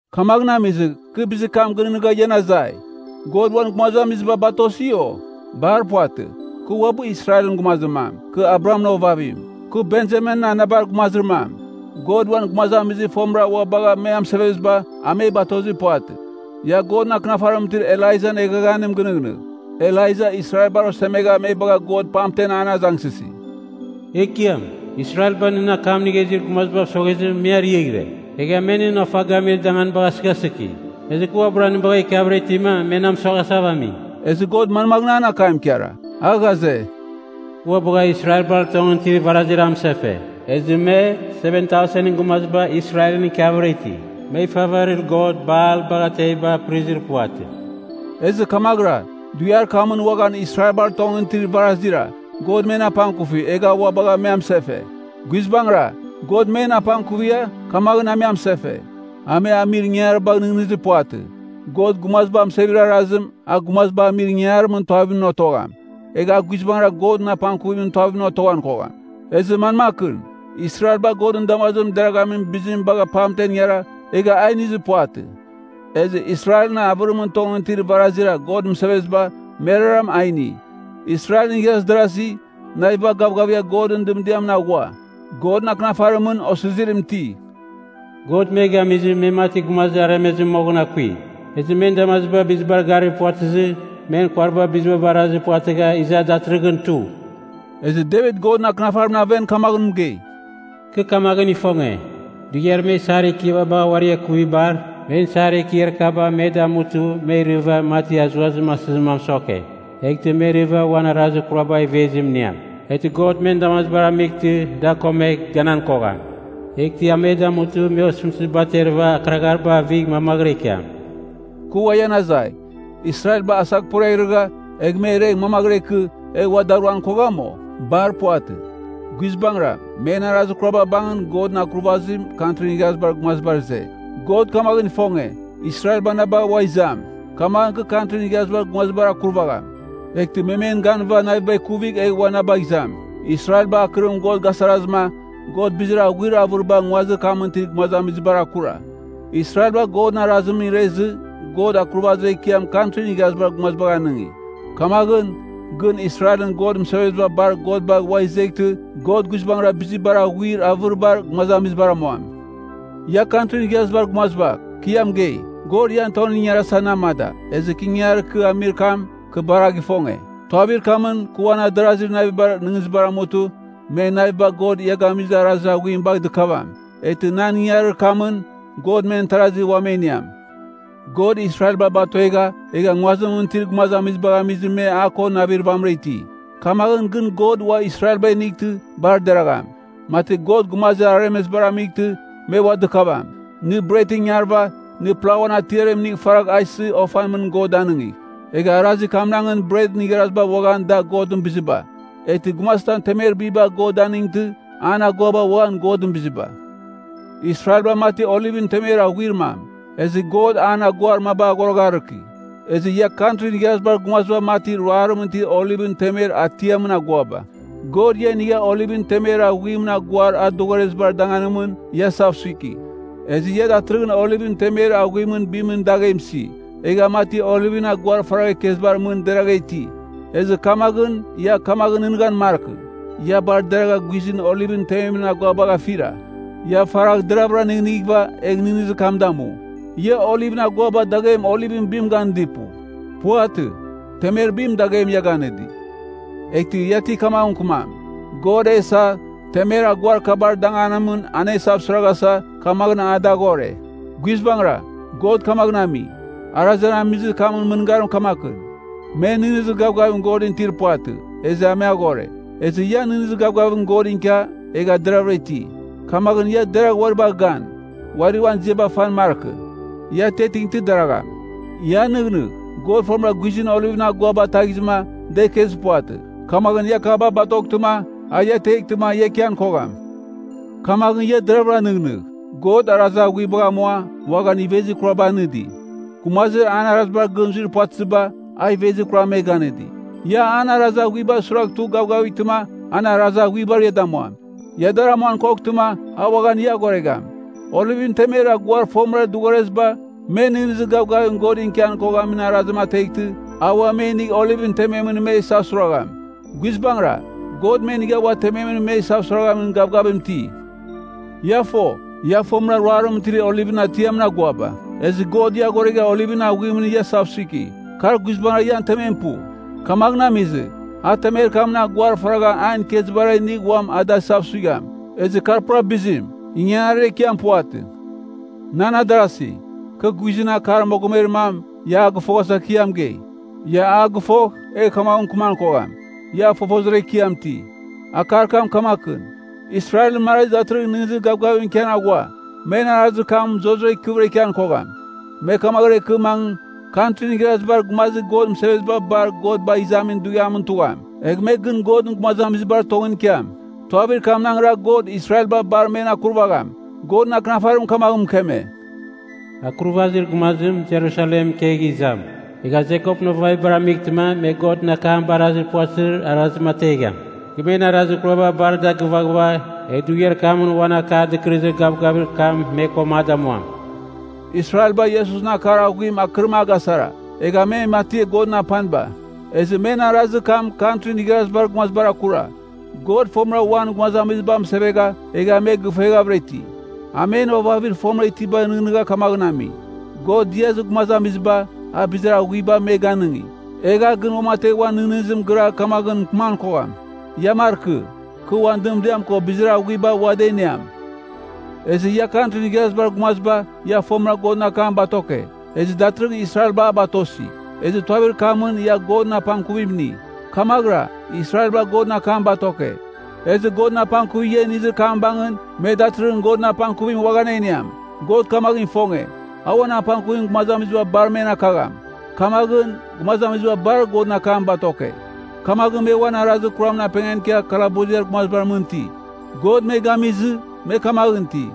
Kamaghɨn amizɨ, kɨ bizir kam gɨnɨghnɨgha ian azai, God uan gumazamiziba batosi, o? Bar puvatɨ! Kɨ uabɨ Israelɨn gumazir mam, kɨ Abrahamɨn ovavim, kɨ Benjaminɨn anabar gumazir mam. God uan gumazamizir fomɨra ua bagha me amɨseveziba, a me batozir puvatɨ. Ia Godɨn Akɨnafarimɨn itir Elaijan eghaghanim gɨnɨghnɨgh. Elaija Israelbar osemegha me bagha God pamtem an azangsɨsi, “Ekiam, Israelba nɨn akam inigha izir gumazibav soghezɨ me ariaghɨre, egha me nɨn ofa gamir danganiba gasɨghasɨki. Ezɨ kɨ uabɨra nɨ bagha ikiavɨra itima, me na mɨsoghasava ami.” Ezɨ God manmaghɨn an akam ikara? A ghaze, “Kɨ ua bagha Israelbar tongɨn itir varazira amɨsefe, ezɨ me, 7000ɨn gumaziba Israelɨn ikiavɨra iti. Me ifavarir god Baal bagha teviba apɨrizir puvatɨ.” Ezɨ kamaghɨra, dughiar kamɨn uaghan Israelbar tongɨn itir varazira, God men apangkufi, egha a ua bagha me amɨsefe. Guizbangɨra, God men apangkuvigha, kamaghɨn a me amsefe. A me amir ingangaribagh nɨghnɨzir puvatɨ. God gumaziba amɨsevezir arazim, a gumaziba amir ingangarimɨn tuavimɨn otogham, egh a guizbangɨra Godɨn apangkuvimɨn tuavimɨn otoghan kogham. Ezɨ manmakɨn? Israelba Godɨn damazimɨn deraghamin bizim bagha pamtem ingara, egha a inizir puvatɨ. Ezɨ Israelɨn avɨrimɨn tongɨn itir varazira God mɨseveziba, merara a ini. Israelɨn igharaz darazi, naviba gavgavigha Godɨn dɨmdiamɨn aghua. Godɨn Akɨnafarimɨn osizirim iti, “God me gamizɨ, me mati gumazir aremezim moghɨn akui. Ezɨ men damaziba bizibar garir puvatɨzɨ, men kuariba biziba barazir puvatɨgha, iza datɨrɨghɨn tu.” Ezɨ Devit Godɨn Akɨnafarimɨn aven kamaghɨn mɨgei, “Kɨ kamaghɨn ifonge, dughiar me isar ekiaba bagha uari akuvibar, men isar ekiar kaba me damutɨ me irɨva, mati azuazim asɨzim a mɨsoke. Eghtɨ me irɨva, uan arazir kurabar ivezim iniam. Eghtɨ God men damazibar amightɨ da komegh, ganan kogham. Eghtɨ a me damutɨ me osɨmtɨziba aterɨva akɨraghariba avigh mamaghɨra ikiam.” Kɨ ua ian azai, Israelba asaghporiaghrɨgha, egh me iregh mamaghɨra ikɨ, egh ua daruan kogham, o? Bar puvatɨ! Guizbangɨra, men arazir kuraba bangɨn Godɨn akurvazim Kantrin Igharazibar Gumazibar ize. God kamaghɨn ifonge, Israelba na bagh ua izam, kamaghɨn kɨ Kantrin Igharazibar Gumazibar akurvagham, eghtɨ me men ganɨghɨva naviba ikuvigh egh ua na bagh izam. Israelba akɨrim God gasarazɨma, God bizir aghuir avɨriba nguazir kamɨn itir gumazamizibar akura. Israelba Godɨn arazimɨn irezɨ, God akurvazir ekiam Kantrin Igharazibar Gumazibagh anɨngi. Kamaghɨn, gɨn Israelɨn God mɨseveziba bar God bagh ua izeghtɨ, God guizbangɨra bizir bar aghuir avɨribar gumazamizibar amuam. Ia Kantrin Igharazibar Gumaziba, kɨ ia mɨgei, God ian tongɨn ingarasa na amada, ezɨ ingangarir kɨ amir kam, kɨ bar a gifonge. Tuavir kamɨn, kɨ uan adarazir navibar nɨghnɨzibar amutɨ, men naviba God ia gamizir arazir aghuim bagh dɨkavam. Eghtɨ nan ingangarir kamɨn, God men tarazi ua me iniam. God Israelba batuegha, egha nguazimɨn itir gumazamizibagh amizɨma me a ko navir vamɨra iti. Kamaghɨn gɨn God ua Israelba inightɨ, bar deragham, mati God gumazir aremezibar amightɨ, me ua dɨkavam. Nɨ bretɨn ingarɨva, nɨ plauan atiaritam inigh faragh a isɨ ofan mɨn God danɨngigh. Egh arazir kamnangɨn bretɨn igharaziba uaghan da Godɨn biziba. Eghtɨ, gumazitam temer biba God danɨngtɨ, an aguaba uaghan Godɨn biziba. Israelba mati olivɨn temer aghuir mam, ezɨ God an aguar maba aghoragharɨki. Ezɨ ia Kantrin Igharazibar Gumaziba mati ruarimɨn itir olivɨn temer atiamɨn aguaba. God ia inigha olivɨn temer aghuimɨn aguar a dɨghorezibar danganimɨn ia isavsuiki. Ezɨ ia datɨrɨghɨn olivɨn temer aghuimɨn bimɨn daghem isi, egha mati olivɨn aguar faragha ikezibar mɨn deragha iti. Ezɨ kamaghɨn, ia kamaghɨn nɨghnɨghan markɨ, ia bar deragha guizɨn olivɨn tememɨn aguabagh afira. Ia faragha deravɨra nɨghnɨghɨva, egh nɨghnɨzir kam damu. Ia olivɨn aguaba daghem olivɨn bim ganɨdir pu. Puvatɨ. Temer bim daghem ia ganɨdi. Eghtɨ ia ti kamaghɨn mɨkɨmam, God e isa, temer aguar kabar danganimɨn an e isavsuiraghasa, kamaghɨn a dar aghore. Guizbangɨra, God kamaghɨn ami. Arazir an amizir kamɨn mɨngarim kamakɨn, me nɨghnɨzir gavgavim Godɨn itir puvatɨ, ezɨ a me aghore. Ezɨ ia nɨghnɨzir gavgavim Godɨn ikia, egha deravɨra iti. Kamaghɨn ia deragh uari bagh gan, uari uan ziaba fan markɨ. Ia atiatingtɨ deragham. Ia nɨghnɨgh, God fomɨra guizɨn olivɨn aguaba ataghizɨma, da ikezir puvatɨ. Kamaghɨn ia akaba batoghtɨma, a ia ateghtɨma ia ikian kogham. Kamaghɨn ia deravɨra nɨghnɨgh. God arazir aghuibagh amua, uaghan ivezir kuraba anɨdi. Gumazir an arazibar gɨn zuir puvatɨziba, a ivezir kuram me ganɨdi. Ia an arazir aghuibar suiragh tugh gavgavightɨma, an arazir aghuibar ia damuam. Ia dar amuan koghtɨma, a uaghan ia aghoregham. Olivɨn temer aguar a fomɨra dɨghoreziba, me nɨghnɨzir gavgavim Godɨn ikian koghamin arazim ateghtɨ, a ua me inigh olivɨn tememɨn me isavsuiragham. Guizbangɨra, God me inigh ua tememɨn me isavsuiraghamin gavgavim iti. Ia fo, ia fomɨra ruarimɨn itir olivɨn atiamɨn aguaba, ezɨ God ia aghoregha olivɨn aghuimɨn ia isavsuiki. Kar guizbangɨra ian temem pu. Kamaghɨn amizɨ, a temer kamɨn aguar faragha an ikezibara inigh uam ada isavsuigham, ezɨ kar pura bizim, ingangarir ekiam puvatɨ. Nan adarasi, kɨ guizɨn akar mogomer mam ia a gɨfoghasa kɨ ia mɨgei. Ia a gɨfogh, egh kamaghɨn mɨkɨman kogham, ia fofozir ekiam iti. Akar kam kamakɨn: Israelɨn marazi datɨrɨghɨn nɨghnɨzir gavgavim ikian aghua; men arazir kam zurara ikɨvɨra ikian kogham. Me kamaghɨra ikɨ mangɨ, Kantrin Igharazibar Gumazir God mɨseveziba bar God bagh izamin dughiamɨn tugham. Egh me gɨn Godɨn gumazamizibar tongɨn ikiam. Tuavir kamnangra God Israelba bar men akurvagham. Godɨn Akɨnafarim kamaghɨn mɨkeme, “Akurvazir Gumazim Jerusalemɨn ikegh izam. Egh a Jekopɨn ovavibar amightɨma me Godɨn akam barazir puvatɨzir arazim ategham. Kɨ men arazir kuraba bar da agɨvaghɨva, egh dughiar kamɨn uan Akar Dɨkɨrɨzir Gavgavir kam me ko a damuam.” Israelba Iesusɨn akar aghuim akɨrim agasara, egha me mati Godɨn apaniba. Ezɨ men arazir kam Kantrin Igharazibar Gumazibar akura. God fomɨra uan gumazamiziba amɨsevegha, egha me gifueghavɨra iti. A men ovavir fomɨra itibagh nɨghnɨgha kamaghɨn ami. God diazir gumazamiziba, a bizir aghuiba me ganɨngi, egh a gɨn uamategh uan nɨghnɨzim giragh kamaghɨn mɨkɨman kogham, ia markɨ, kɨ uan dɨmdiam ko bizir aghuiba ua da iniam. Ezɨ ia Kantrin Igharazibar Gumaziba, ia fomɨra Godɨn akam batoke, ezɨ datɨrɨghɨn Israelba a batosi, ezɨ tuavir kamɨn ia Godɨn apangkuvim ini. Kamaghɨra, Israelba Godɨn akam batoke. Ezɨ Godɨn apangkuvir ia inizir kam bangɨn, me datɨrɨghɨn Godɨn apangkuvim uaghan a iniam. God kamaghɨn ifonge, a uan apangkuvim gumazamiziba bar men akagham. Kamaghɨn, gumazamiziba bar Godɨn akam batoke. Kamaghɨn me uan arazir kuramɨn apengan ikia kalabuziar gumazibar mɨn iti. God me gamizɨ, me kamaghɨn iti.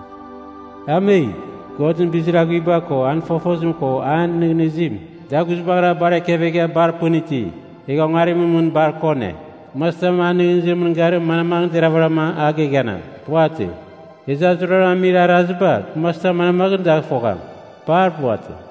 Ame! Godɨn bizir aghuiba ko an fofozim ko an nɨghnɨzim, da guizbangɨra bar ekevegha bar pɨn iti! Egha ongarimɨn mɨn bar kone! Gumazitam an nɨghnɨzimɨn mɨngarim manmaghɨn deravɨram a geghanam? Puvatɨ. Ezɨ a zuraram amir araziba, gumazitam manmaghɨn dagh fogham? Bar puvatɨ!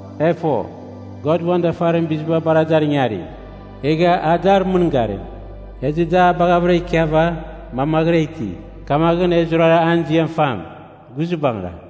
E fo, God uan dafarimɨn biziba bar dar ingari, egha a dar mɨngarim, ezɨ da a baghavɨra ikiava, mamaghɨra iti. Kamaghɨn e zurara an ziam fam! Guizbangɨra.